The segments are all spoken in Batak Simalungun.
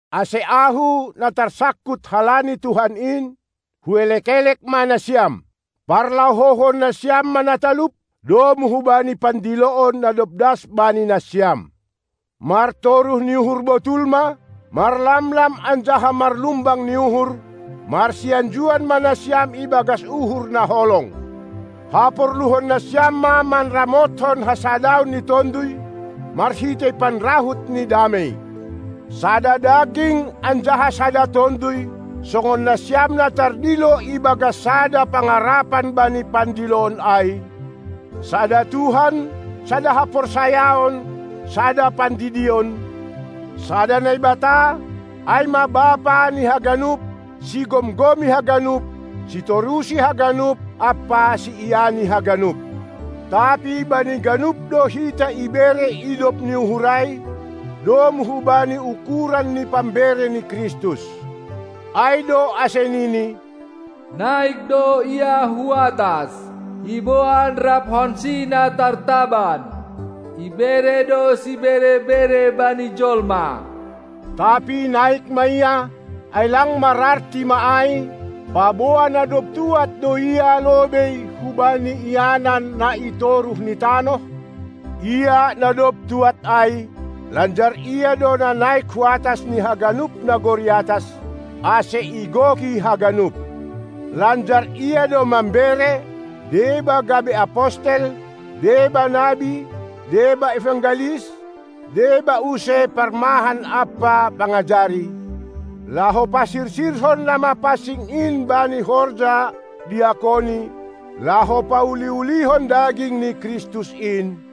Ase ahu, na tarsangkut halani Tuhan in, huelek-elek ma nasiam: Parlahouhon nasiam ma na talup, domu hubani pandiloon na dob das bani nasiam! Martoruh ni uhur botul ma, marlamlam anjaha marlumbang ni uhur, marsianjuan ma nasiam ibagas uhur na holong! Haporluhon nasiam ma manramothon hasadaon ni tonduy, marhitei panrahut ni damei. Sada daging anjaha sada tonduy, songon nasiam na tardilo ibagas sada pangarapan bani pandiloon ai, sada Tuhan, sada haporsayaon, sada pandidion, sada Naibata, ai ma Bapa ni haganup, sigomgomi haganup, sitorusi haganup ampa siiani haganup. Tapi bani ganup do hita ibere idop ni uhur ai domu hubani ukuran ni pambere ni Kristus. Ai do ase nini: Naik do Ia hu atas, iboan raphon-Si na tartaban; ibere do sibere-bere bani jolma. Tapi naik ma Ia, ai lang mararti ma ai, paboa na dob tuad do Ia lobei hubani ianan na itoruh ni tanoh? Ia, na dob tuad ai, lanjar Ia do na naik huatas ni haganup nagori atas, ase igoki haganup. Lanjar Ia do mambere deba gabe apostel, deba nabi, deba evangelis, deba use parmahan ampa pangajari, laho pasirsirhon na mapansing in bani horja diakoni, laho pauli-ulihon daging ni Kristus in,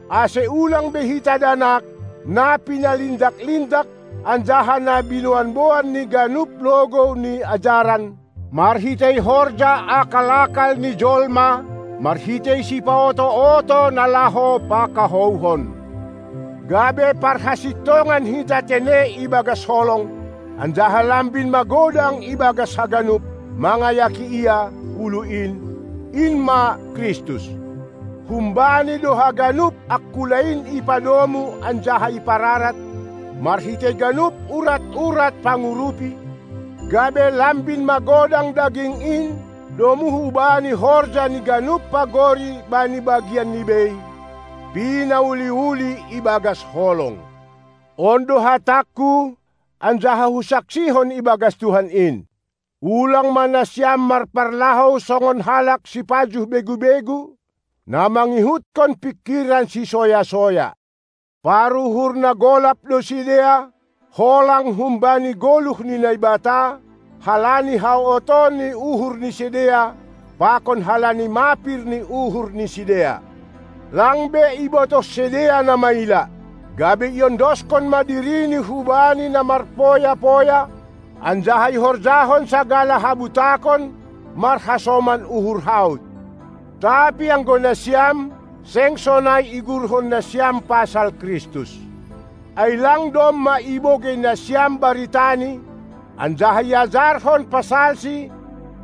ase ulang be hita danak, na pinalindak-lindak anjaha na binoanboan ni ganup logou ni ajaran, marhitei horja akal-akal ni jolma, marhitei sipaoto-oto na laho pakahouhon. Gabe parhasintongan hita tene ibagas holong, anjaha lambin magodang ibagas haganup, mangayaki Ia, Ulu in, in ma Kristus. Hum-Bani do haganup angkula in ipadomu anjaha iparapat, marhitei ganup urat-urat pangurupi, gabe lambin magodang daging in domu hubani horja ni ganup pagori bani bagianni bei, pinauli-uli ibagas holong. On do hatangku anjaha husaksihon ibagas Tuhan in: Ulang ma nasiam marparlahou songon halak sipajuh begu-begu, na mangihutkon pingkiran sisoya-soya. Paruhur na golap do sidea, holang humbani goluh ni Naibata, halani haotoon ni uhur ni sidea, pakon halani mapir ni uhur ni sidea. Lang be ibotoh sidea na maila, gabe iondoskon ma dirini hubani na marpoya-poya anjaha ihorjahon sagala habutakon marhasoman uhur haut. Tapi anggo nasiam, seng sonai iguruhon nasiam pasal Kristus. Ai Lang domma ibogei nasiam baritaNi, anjaha iajarhon pasal-Si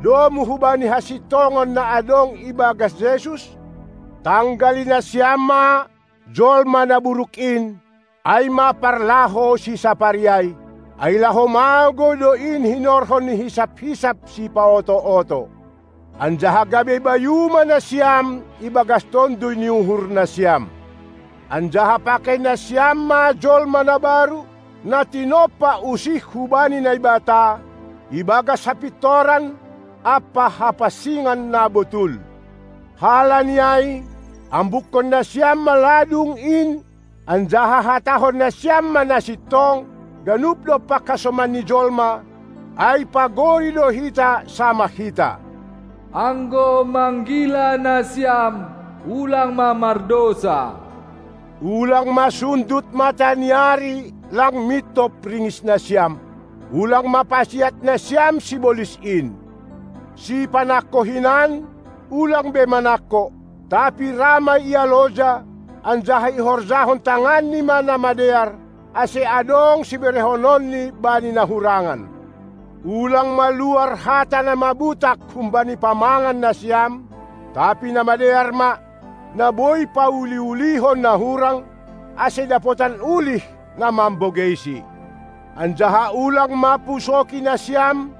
domu hubani hasintongan na adong ibagas Jesus? Tanggali nasiam ma jolma na buruk in, ai ma parlahou sisapari ai, ai laho magou do in hinorhon ni hisap-hisap sipaoto-oto. Anjaha gabe bayu ma nasiam ibagas tonduy ni uhur nasiam Anjaha pakei nasiam ma jolma na baru, na tinompa usih hubani Naibata, ibagas hapintoran ampa hapansingon na botul. Halani ai ambukkon nasiam ma ladung in anjaha hatahon nasiam ma na sintong, ganup dompak hasomanni jolma, ai pagori do hita samah hita. Anggo manggila nasiam ulang ma mardousa! Ulang ma sundut mataniari, lang mintop ringis nasiam. Ulang ma pasiat nasiam sibolis in! Sipanangko hinan, ulang be manangko, tapi ra ma ia loja, anjaha ihorjahon tanganni ma na madear, ase adong siberehononni bani na hurangan. Ulang ma luar hata na mabutak humbani pamangan nasiam, tapi na madear ma, na boi pauli-ulihon na hurang, ase dapotan ulih, na mambogeisi. Anjaha ulang ma pusoki nasiam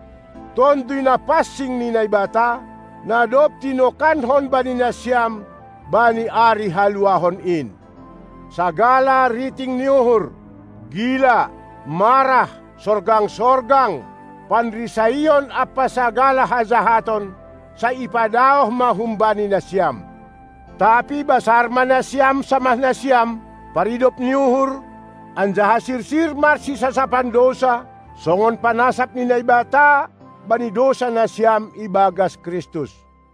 Tonduy Napansing ni Naibata, na dob tinokanhon bani nasiam bani ari haluahon in. Sagala riting ni uhur, gila, marah, sorgang-sorgang, panrisaon ampa sagala hajahaton, sai ipadaoh ma humbani nasiam. Tapi basar ma nasiam samah nasiam, paridop ni uhur, anjaha sirsir marsisasapan dousa, songon panasap ni Naibata bani dousa nasiam ibagas Kristus.